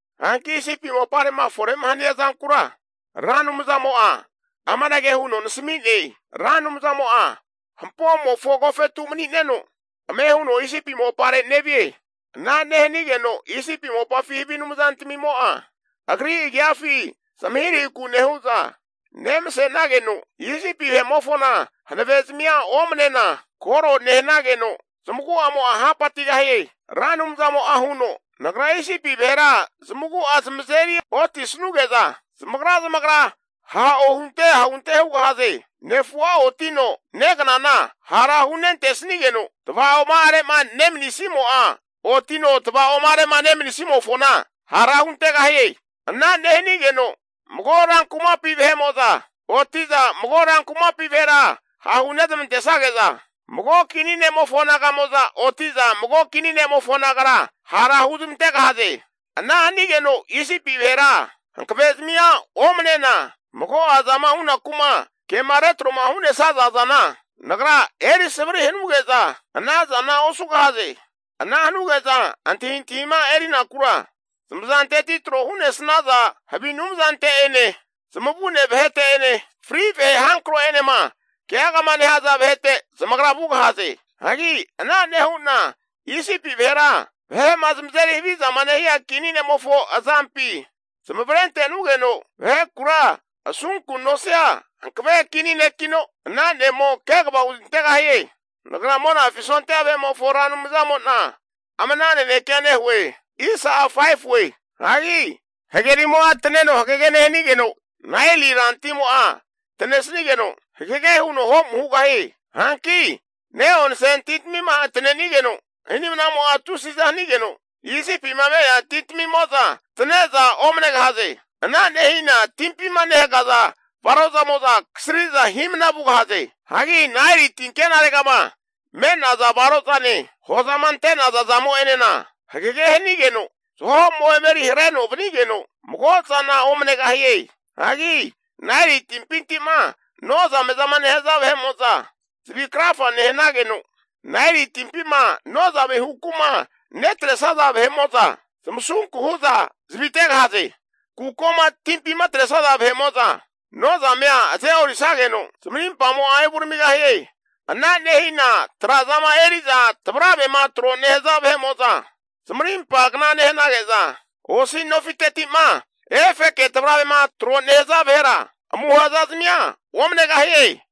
Hanki Isipi mopare'ma fore'ma hania zankura Ra Anumzamo'a amanage huno nasami'ne, Ra Anumzamo'a hampomofo agofetu mani'neno ame huno Isipi mopare nevie. Ana nehanigeno Isipi mopafi havi anumzantamimo'a, Agri agiafi zamahirahiku nehu'za nemase'nageno, Isipi vahe'mofona hanavezmia omnena, kore nehanageno zamagu'amo'a hapatigahie. Ra Anumzamo'a huno, Nagra Isipi vahera zamagu'a zamazeri otisuge'za zamagra zamagra ha' ohunte ahunte hugahaze. Nefu'a otino negnana hara hunentesnigeno, tava'oma'arema nemanisimo'a otino tvaoma'are'ma nemanisimofona hara huntegahie. Ana nehanigeno mago ran kumapi vahe'mo'za oti'za mago ran kumapi vahera hahu nezmantesnage'za, mago kini ne'mofo naga'mo'za oti'za mago kini ne'mofo nagara hara huzmantegahaze. Ana hanigeno Isipi vahera hankavezmia omanena, mago'azama hunaku'ma kema retro'ma hu'nesaza zana Nagra eri savri hanuge'za, ana zana osugahaze. Ana hanuge'za antahintahima erinakura, zamazanteti tro hu'nesnaza havi anumzante'ene, zamavune vahete'ene, fri vahe hankro'enema keagama nehaza vahete zamagra vugahaze. Hagi ana nehu'na Isipi vahera, vahe'ma zamazeri havizama nehia kini ne'mofo azampi zamavare ante'nugeno, vahekura asunku nosia hankave kini nekino, ana ne'mo kegava huzmantegahie. Nagra Monafi sondia vahe'mofo Ra Anumzamo'na ama'na nanekea nehue. Hagi hagerimo'a taneno hagege nehanigeno, Naeli ran timo'a tanesigeno hagege huno ho'mu hugahie. Hanki ne'onse tintamima tanenigeno, hinimnamo'a tusiza hanigeno, Isipima me'nea tintamimo'za tane'za omanegahaze. Ana nehina timpima nehagaza varozamo'za kasriza himna vugahaze. Hagi Naeli tinkenaregama me'nea varozane, hozama ante'naza zamo'enena hagege hanigeno, zaho'mo emeri hareno vanigeno, mago zana omanegahie. Hagi Naeli timpinti'ma nozamezama nehaza vahe'mo'za zavi krafa nehanageno, Naeli timpima nozame huku'ma netresaza vahe'mo'za zamasunku hu'za zavitegahaze. Kukoma timpima atresaza vahe'mo'za nozamea aze'orisageno, zamarimpamo'a evuramigahie. Ana nehina tra'zama eri'za tavaravema tro nehaza vahe'mo'za, zamarimpa kna nehanage'za, osi nofiteti'ma efeke tavaravema tro nehaza vahera, amuha zazamia omanegahie.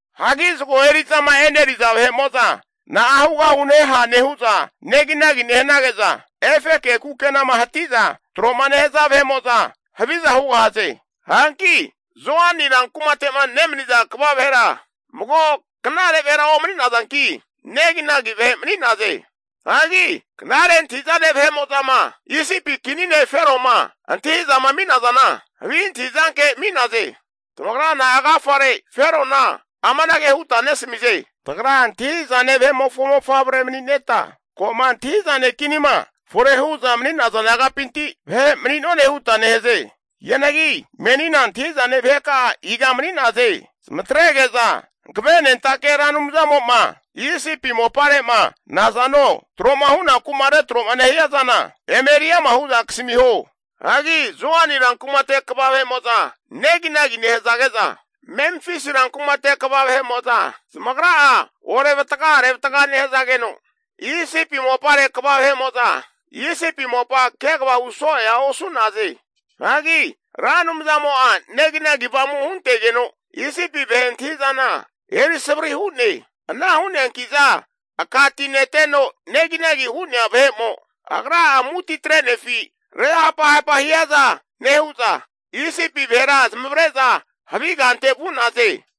Hagi zago eri'zama eneriza vahe'mo'za na'a hugahuneha nehu'za neginagi nehanage'za, efeke kukenama hati'za tro'ma nehaza vahe'mo'za haviza hugahaze. Hanki Zoani ran kumate'ma nemaniza kva vahera mago knare vahera omani'nazanki, negi nagi vahe mani'naze. Hagi knare antahi'zane vahe'mo'zama Isipi kini ne' Feroma antahi'zama ami'nazana, havi antahizanke ami'naze. Tamagra na'a agafare Ferona amanage huta nesamize? Tagra antahi'zane vahe'mofo mofavre mani'neta, ko'ma antahi'zane kinima fore hu'za mani'naza nagapinti vahe mani'none huta nehaze. Hianagi menina antahi'zane vaheka'a iga mani'naze? Zamatrege'za Hankavenentake Ra Anumzamo'ma Isipi mopare'ma nazano tro'ma hunaku'ma retro'ma nehia zana eme eriama hu'za kasamiho. Hagi Zoani ran kumate kva vahe'mo'za neginagi nehazage'za, Memfisi rankumate kva vahe'mo'za zamagra'a orevataga arevatga nehazageno, Isipi mopare kva vahe'mo'za Isipi mopa kegava hu so'ea osu'naze. Hagi Ra Anumzamo'a neginagi avamu huntegeno, Isipi vahe antahi'zana eri savari hu'ne. Ana hu'neanki'za aka ti neteno neginagi hu'nea vahe'mo agra'a amuti atrenefi, re hapahapa hiaza nehu'za Isipi vahera zamavare'za havi kante vu'naze.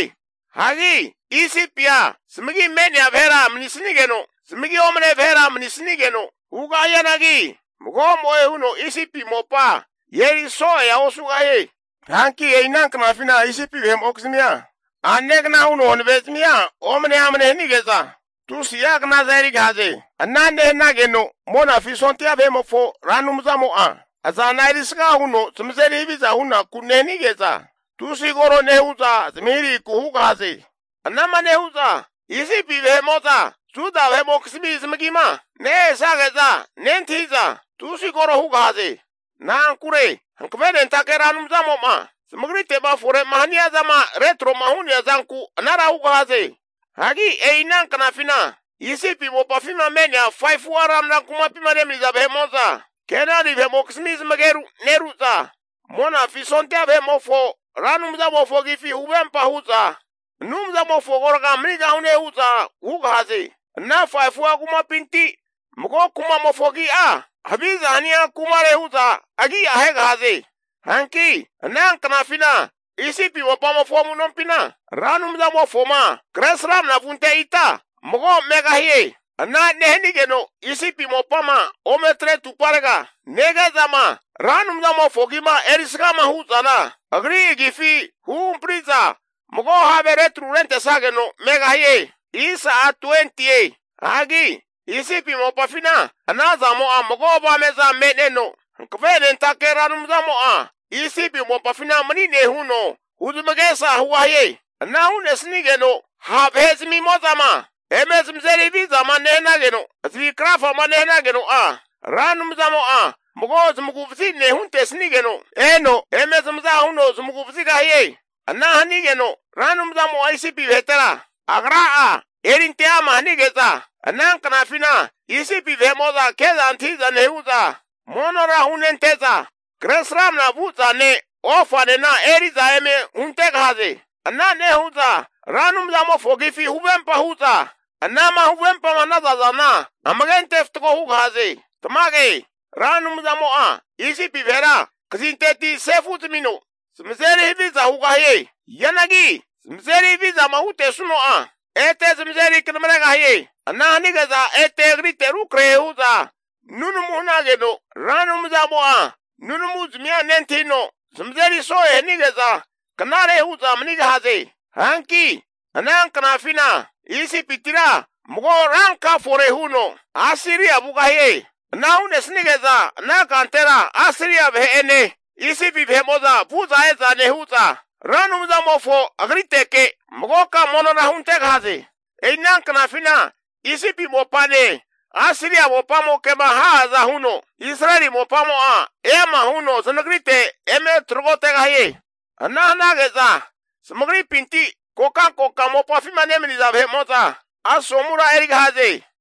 Hagi Isipia zamagi me'nea vahera manisnigeno, zamagi omne vahera manisnigeno hugahianagi, magomo'e huno Isipi mopa eriso'ea osugahie. Hanki e'i ana knafina Isipi vahe'mokizmia a'negna huno hanavezmia omane amne hanige'za, tusi'a knaza erigahaze. Ana nehanageno Monafi sondia vahe'mofo Ra Anumzamo'a azana erisga huno zamazeri haviza hunaku nehanige'za, tusi koro nehu'za zamahirahiku hugahaze. Anama nehu'za Isipi vahe'mo'za Juda vahe'mokizmi zamagima nehesage'za nentahi'za tusi koro hugahaze. Na'ankure Hankavenentake Ra Anumzamo'ma zamagrite'ma fore'ma haniazama retro'ma hu'nea zanku anara hugahaze. Hagi e'i ana knafina Isipi mopafima me'nea 5fu'a ranra kumapima nemaniza vahe'mo'za, Kenani vahe'mokizmi zamageru neru'za, Monafi sondia vahe'mofo Ra Anumzamofo agifi huvempa hu'za, Anumzamofo agorga manigahune hu'za hugahaze. Ana 5fu'a kumapinti mago kumamofo agi'a Zagemofo Kumare hu'za agi'a ahegahaze. Hanki ana knafina Isipi mopamofo amu'nompina Ra Anumzamofoma Kresramana vunte ita mago megahie. Ana nehanigeno Isipi mopama ometre atuparega, nege'zama Ra Anumzamofo agima erisgama hu'zana agri agifi huhampri'za mago have retru rentesnageno megahie. Hagi Isipi mopafina ana zamo'a mago avame'za me'neno, Hankavenentake Ra Anumzamo'a Isipi mopafina mani'ne huno huzmagesa hugahie. Ana hu'nesnigeno ha' vahezmimo'zama eme zamazeri havizama nehanageno, zavi krafama nehanageno'a Ra Anumzamo'a mago zamagu'vazi ne' huntesigeno eno eme zamaza huno zamagu vazigahie. Ana hanigeno Ra Anumzamo'a Isipi vahetera Agra'a erinte ama hanige'za, ana knafina Isipi vahe'mo'za ke'za antahi'za nehu'za, monora hunente'za kresramna vu'zane ofanena eri'za eme huntegahaze. Ana nehu'za Ra Anumzamofo agifi huvempa nehu'za, anama huvempama hanaza zana amage ante fatgo hugahaze. Tamage, Ra Anumzamo'a Isipi vahera knazanteti sefu'zamino zamazeri haviza hugahie. Hianagi zamazeri havizama hutesuno'a, ete zamazeri knamaregahie. Ana hanige'za ete Agrite rukrahe hu'za nunamu hanageno, Ra Anumzamo'a nunamuzmia nentahino, zamazeri so'e hanige'za knare hu'za manigahaze. Hanki ana knafina Isipitira mago ranka fore huno Asiria vugahie. Ana hu'nesnige'za ana kantera Asiria vahe'ene Isipi vahe'mo'za vu'za e'za nehu'za, Ra Anumzamofona Agriteke magoka monora huntegahaze. E'i ana knafina Isipi mopane Asiria mopamokema ha'aza huno, Israeli mopamo'a eama huno zanagrite eme tragotegahie. Ana hanage'za zamagripinti kokankoka mopafima nemani'za vahe'mo'za asomura erigahaze.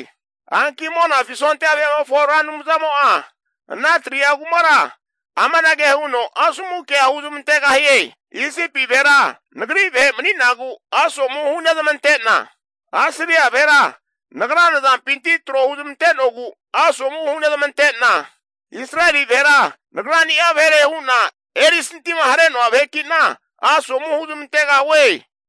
Hanki Monafi sondia vahe'mofo Ra Anumzamo'a ana 3'a kumara amanage huno asomu kea huzmantegahie. Isipi vahera Nagri vahe mani'nagu asomu hunezmante'na, Asiria vahera Nagra nazampinti tro huzmante'nogu asomu hunezmante'na, Israeli vahera Nagrani'a vahere hu'na erisanti'ma hare'noa vahekina asomu huzmantegahue.